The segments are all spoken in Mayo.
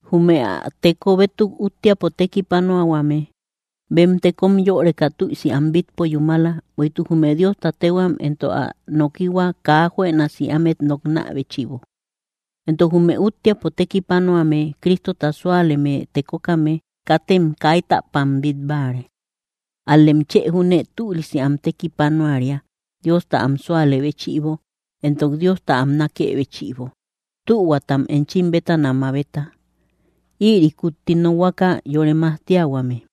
Jume ä teko bétuk úttiapo tékipanuatuahuame, bem tekom yöreka tüisi am bítpo yúmala, bueïtuk jume Diosta téhuam entok ä nokihua kaa juënasi ámet noknä béchïbo. Entok jume úttiapo tekipanuame Cristota súaleme tekokame, katem kaitäpam bít báare; ál‑lem chë júne tülisi am tekipanuaria, Diosta am súalë béchïbo, entok Diosta am nákë béchïbo; tühuatam enchim bétana mabeta. Ïri kutti nokhuaka yore majtiahuame.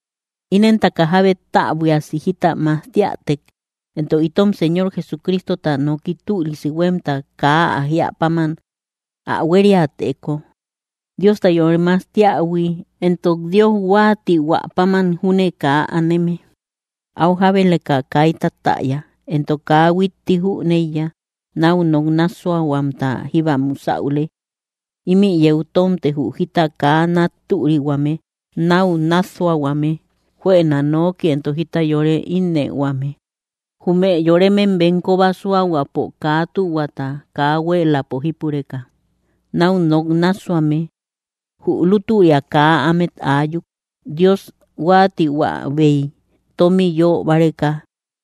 Inentaka jábe täbuiasi jita majtiätek, entok itom Señor Jesucristota noki tülisi huémta kaa ä jíä páman ä huériäteko, Diosta yore majtiähui entok Dios huáatihuä páman júne kaa aneme, áu jábeleka kaita täya. Entok kaa huitti jüneiya. Náu nok nássuahuamta jíba musäule; ímï yeu tómte jü jita kaa nat türihuame, náu nássuahuame, juëna nooki entok jita yoret ínnëhuame, jume yoremem bem kóba súahuapo kaa tühuata kaa huéeläpo jípureka, náu nok nássuame. Jü lútüria kaa ámet aayuk, Dios huáatihuäbey tómi yö báreka.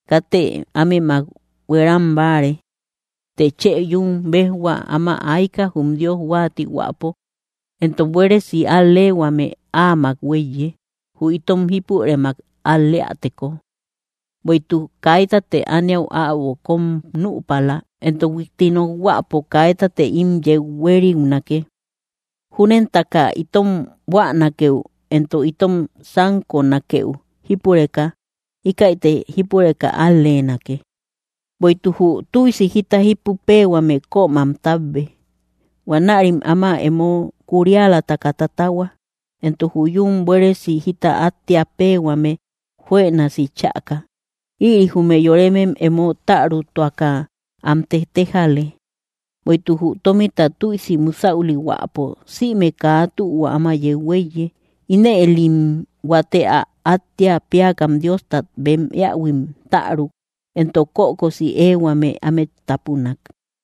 Katë ámemak hueram báare. Të chë yún béjhuaa áma ayka, jum Dios huáatihuäpo, entok buéresi al‑leehuame áamak huéiye, jü itom jípurëmak al‑leäteko. Bueïtuk kaitate ániau äbo kóm nüpala, entok huitti nokhuäpo kaitate ím yeu huériunake. Júnentaka itom buänakeu entok itom sánkonakeu jípureka, íkäite jípureka al‑leenake. Bueïtuk jü tüisi jita jípu péehuame kömam tábbe; huanärim áma emo kurialataka tatahua, entok jü yún buéresi jita áttea péehuame juënasi chäka. Ïri jume yoremem emo tärutuaka am tetejale. Bueïtuk jü tómita tüisi musäulihuäpo, sïme kaa tühua áma yeu huéiye. Inëlim huate ä áttia péakam Diostat bem eähuim täruk, entok kökosi éehuame ámet tápunak.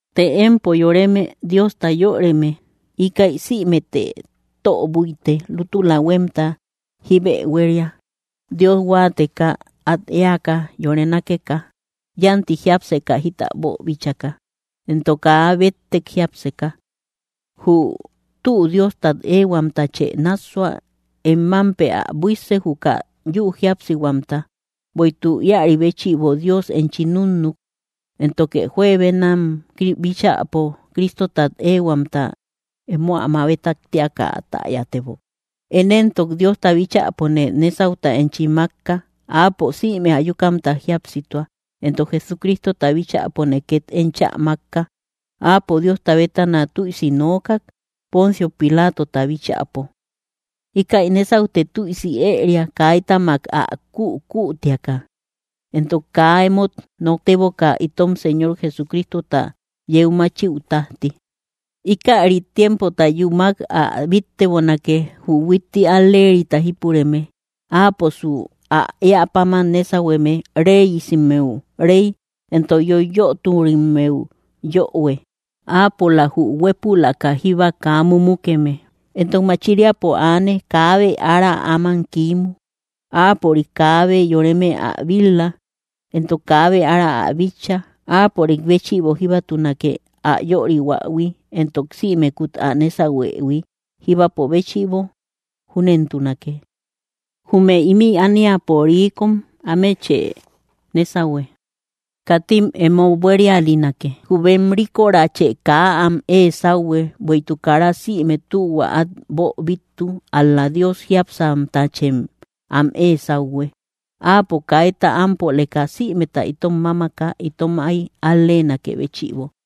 Të empo yoreme, Diosta yöreme, íkäi sïmete tö búite. Lútula éehuamta jíbe huéria, Dios huáateka, at eäka, yore nákeka, yánti jiápseka jita boobíchaka, entok kaa béttek jiápseka. Jü tü Diostat éehuamtachë nássua; em mámpe ä buísse juka yü jíapsihuamta; bueïtuk íäri béchïbo Dios enchi núnnuk, éntoke juebenam bíchäpo Cristotat éehuamta emo ä mabetak tíaka ä täyatebok. Én entok, Diosta bíchäpone nésauta enchi mákka. Áapo sïme ayukamta jíapsitua, entok Jesucristota bíchäpone két enchä mákka, Áapo Diosta bétana tüisi nookak, Poncio Pilaatota bíchäpo. Ikäi nésautë tüisi ëeria, kaitamak ä kükütiaka, entok kaa emót nokteboka, itom Señor Jesucristota yeu máchiaü tájti. Íkäri tiempota yúmak ä bíttebonake, jü huitti al‑leerita jípureme. Áaposu ä éä páman nésahueme; reyesimmeu Rey entok yoiyöturimmeu Yöhue. Áapola jü huépülaka jíba kaa mumukeme, entok machiriapo aane; kaabe ára áman kiimu. Áapörik kaabe yoreme ä bil-la, entok kaabe ára ä bitcha. ¡Áapörik béchïbo jíbatunake ä yörihuähui entok símekut ä nésahuëhui, jíbapo béchïbo! Júnentunake. Jume ímï ániapo riikom, ámechë nésahue, katim emo buérialinake, jü bem ríkorache kaa am ée sáuhue, bueïtuk kara sïme tühua át boobittu; ál‑la Dios jiápsamtachem am ée sáuhue. Áapo kaita ámpoleka sïmeta itom mámaka, itom áy al‑leenakë béchïbo.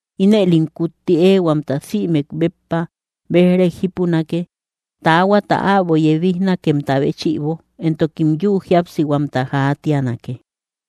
Inëlim kutti éehuamta sïmek béppa béj‑rek jípunake, taahuata äbo yebijnakemta béchïbo, entokim yü jíapsihuamta jaatianake.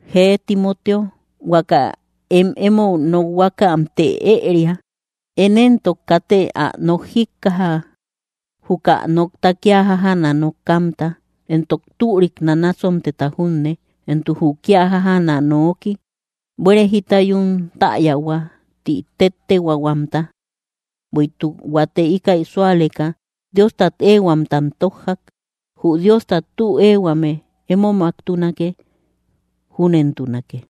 Jee, Timoteo, huaka em emou nokhuamte ëria. Én éntok, kate ä nok jíkkaja, juka nokta kía jájaana nokamta entok türik nanasontemta junne, entok jü kía jájaana nooki, “buére jita yún täyahua” ti téttehuaahuamta. Bueïtuk huate íkäi súaleka, Diostat éehuamtam tójjak. Jü Diosta tü éehuame emomaktunake. Júnentunake.